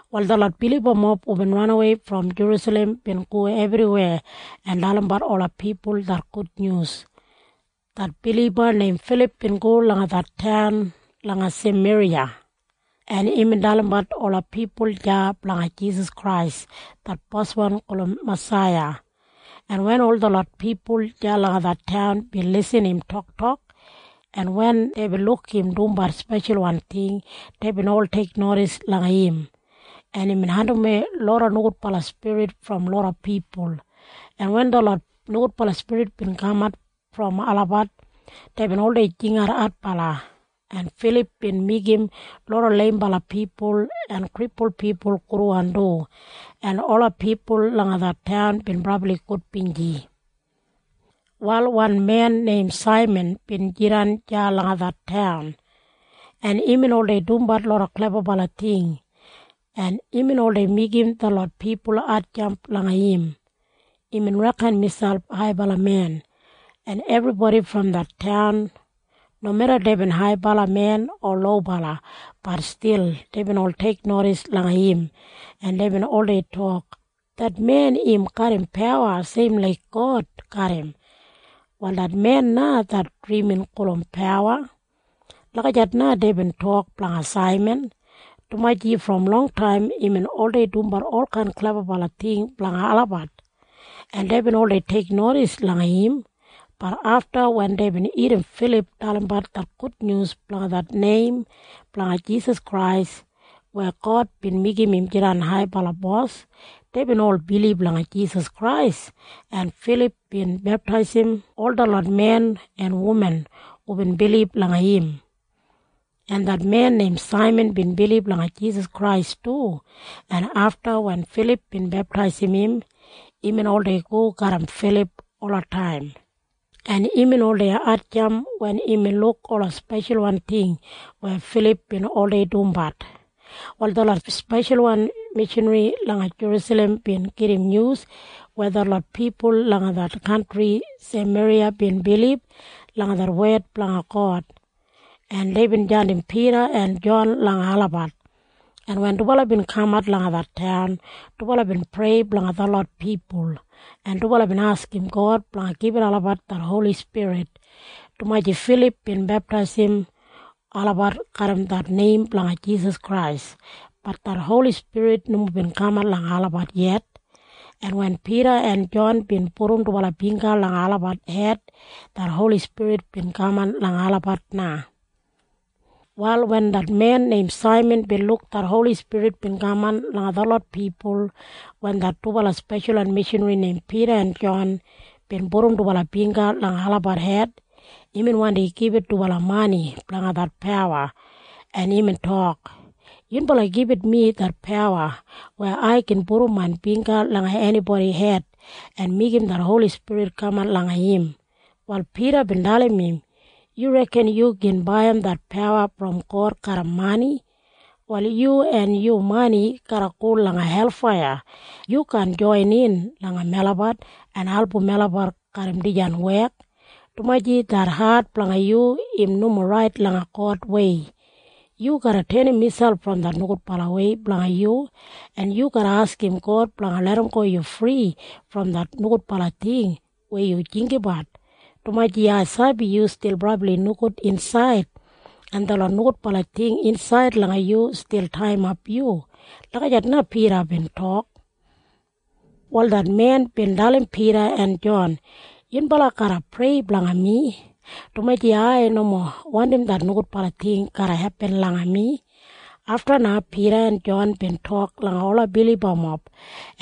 Wal detlot bilibamob hubin ranawei brom Jerusalem bin go ebriweya en dalimbat ola pipul det gudnyus. Det biliba neim Filip bin go langa det taun langa Sameriya, en imbin dalimbat ola pipul deya blanga Jisas Krais det Boswan gulum Masaiya, en wen ol detlot pipul deya langa det taun bin lisin im toktok, en wen deibin luk im dumbat speshalwan ting, deibin ol teiknodis langa im, en imbin andimwei loda nogudbala spirit brom loda pipul, en wen detlot nogudbala spirit bin kamat brom olabat, deibin oldei jingat adbala, en Filip bin meigim loda leimbala pipul en kripul pipul gudwan du, en ola pipul langa det taun bin brabli gudbinji. Wal wan men neim Saiman bin jidan deya langa det taun, en imbin oldei dumbat loda klebabala ting, en imbin oldei meigim detlot pipul hatjamp langa im. Imbin reken miselp haibala men, en ebribodi brom det taun, nomeda deibin haibala men o lobala, bat stil deibin ol teiknodis langa im, en deibin oldei tok, “Det men im garram pawa seim laik God garram. Wal det men na det drimin gulum Pawa.” Lagijat na deibin tok blanga Saiman, dumaji brom longtaim imbin oldei dumbat olkain klebabala ting blanga olabat, en deibin oldei teiknodis langa im. Bat afta wen deibin irrim Filip dalimbat det gudnyus blanga det neim blanga Jisas Krais weya God bin meigim im jidan Haibala Bos, deibin ol bilib langa Jisas Krais, en Filip bin beptaisim ol detlot men en wuman hubin bilib langa im, en det men neim Saiman bin bilib langa Jisas Krais du, en afta wen Filip bin beptaisim im, imbin oldei go garram Filip olataim, en imbin oldei hatjamp wen imbin luk ola speshalwan ting weya Filip bin oldei dumbat. Wal detlot speshalwan mishanri langa Jerusalem bin gedim nyus weya detlot pipul langa det kantri Sameriya bin bilib langa det wed blanga God, en deibin jandim Pida en Jon langa olabat, en wen dubala bin kamat langa det taun, dubala bin prei blanga detlot pipul, en dubala bin askim God blanga gibit olabat det Holi Spirit, dumaji Filip bin beptaisim olabat garram det neim blanga Jisas Krais. Bat det Holi Spirit nomo bin kaman langa olabat yet. En wen Pida en Jon bin pudum dubala bingga langa olabat hed, det Holi Spirit bin kaman langa olabat na. Wal wen det men neim Saiman bin luk det Holi Spirit bin kaman langa detlot pipul wen det dubala speshalwan mishanri neim Pida en Jon bin pudum dubala bingga langa olabat hed, imbin wandi gibit dubala mani blanga det pawa, en imbin tok, “Yunbala gibit mi det pawa weya ai gin pudum main bingga langa enibodi hed en meigim det Holi Spirit kaman langa im.” Wal Pida bin dalim im, “Yu reken yu gin baiyim det pawa brom God garram mani? Wal yu en yu mani garra go langa helfaiya. Yu kaan joinin langa melabat en album melabat garram dijan wek, dumaji det hat blanga yu im nomo rait langa Godwei. Yu garra tenim miselp brom det nogudbalawei blanga yu, en yu garra askim God blanga larramgo yu fri brom det nogudbala ting weya yu jinggabat, dumaji ai sabi yu stil brabli nogud insaid, en detlot nogudbala ting insaid langa yu stil taiyimap yu.” Lagijat na Pida bin tok. Wal det men bin dalim Pida en Jon, “Yunbala garra prei blanga mi, dumaji ai nomo wandim det nogudbala ting garra hepin langa mi.” Afta na Pida en Jon bin tok langa ola bilibamob,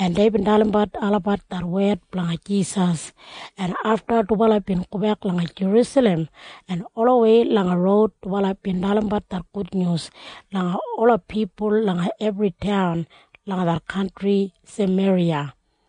en deibin dalimbat olabat det wed blanga Jisas, en afta dubala bin gobek langa Jerusalem, en olawei langa roud dubala bin dalimbat det gudnyus langa ola pipul langa ebri taun langa det kantri Sameriya.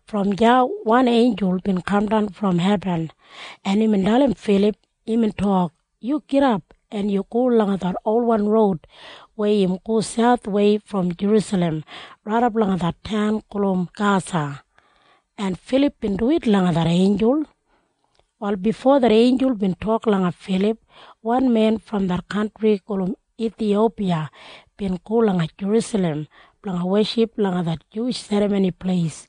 Brom deya wan einjul bin kamdan brom hebin, en imbin dalim Filip. Imbin tok, “Yu gidap en go langa det olwan roud weya im go sauthwei brom Jerusalem raidap langa det taun gulum Gasa.” En Filip bin duwit langa det einjul. Wal bifo det einjul bin tok langa Filip, wan men brom det kantri gulum Ithiyopiya bin go langa Jerusalem blanga weship langa det Juwish Serramoni Pleis.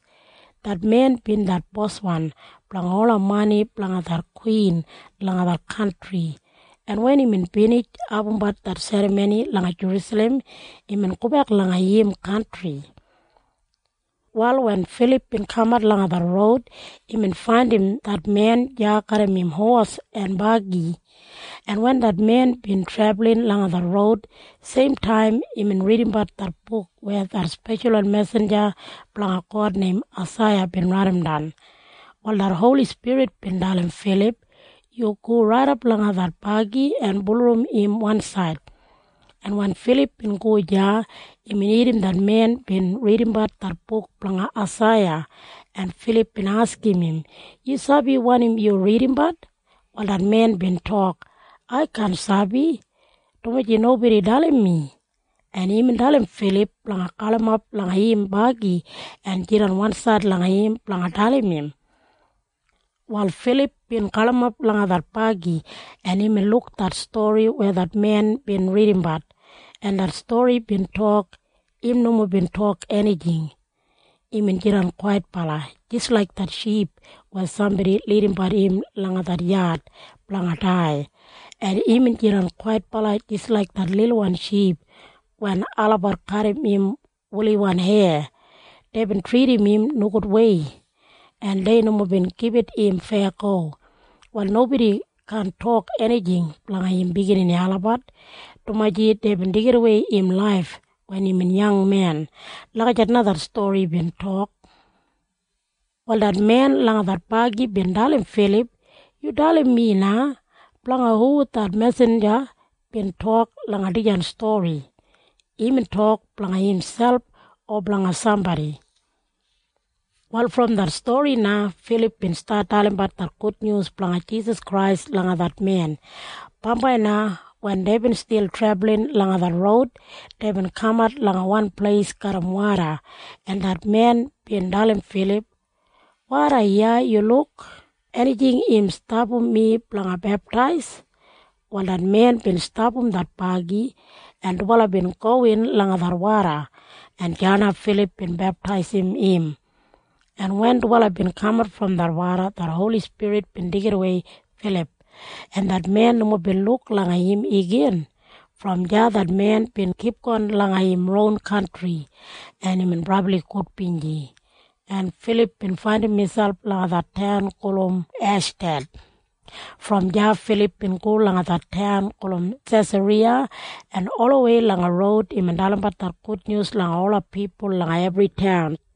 Det men bin det boswan blanga ola mani blanga det kwin langa det kantri, en wen imbin binij abumbat det serramoni langa Jerusalem, imbin gobek langa im kantri. Wal wen Filip bin kamat langa det roud, imbin faindim det men deya garram im hos en bagi, en wen det men bin trebulin langa det roud, seimtaim imbin ridimbat det buk weya det speshalwan mesinja blanga God neim Aisaiya bin raidimdan. Wal det Holi Spirit bin dalim Filip, “Yu go raidap langa det bagi en bulurrum im wansaid.” En wen Filip bin go deya, imbin irrim det men bin ridimbat det buk blanga Aisaiya, en Filip bin askim im, “Yu sabi wanim yu ridimbat?” Wal det men bin tok, “Ai kaan sabi, dumaji nobodi dalim mi.” En imbin dalim Filip blanga galimap langa im bagi en jidan wansaid langa im blanga dalim im. Wal Filip bin galimap langa det bagi, en imbin luk det stori weya det men bin ridimbat, en det stori bin tok, “Im nomo bin tok enijing. Imbin jidan kwaitbala, jis laik det ship weya sambodi lidimbat im langa det yad blanga dai. En imbin jidan kwaitbala jis laik det lilwan ship wen olabat kadim im wuliwan heya. Deibin tridim im nogudwei, en dei nomo bin gibit im feyago. Wal nobodi kaan tok enijing blanga im biginini olabat, dumaji deibin deigidawei im laif wen imbin yangmen.” Lagijat na det stori bin tok. Wal det men langa det bagi bin dalim Filip, “Yu dalim mi na. Blanga hu det mesinja bin tok langa dijan stori? Imbin tok blanga imselp o blanga sambodi?” Wal brom det stori na Filip bin stat dalimbat det gudnyus blanga Jisas Krais langa det men. Bambai na wen deibin stil trebulin langa det roud, deibin kamat langa wan pleis garram woda, en det men bin dalim Filip, “Woda iya luk! Enijing gin stapam mi blanga beptais?” Wal det men bin stapam det bagi, en dubala bin gowin langa det woda, en deya na Filip bin beptaisim im, en wen dubala bin kamat brom det woda, det Holi Spirit bin deigidawei Filip, en det men nomo bin luk langa im igin. Brom deya det men bin kipgon langa im ron kantri, en imbin brabli gudbinji, en Filip bin faindim miselp langa det taun gulum Eshdad. Brom deya Filip bin go langa det taun gulum Sesariya, en olawei langa roud imbin dalimbat det gudnyus langa ola pipul langa ebri taun.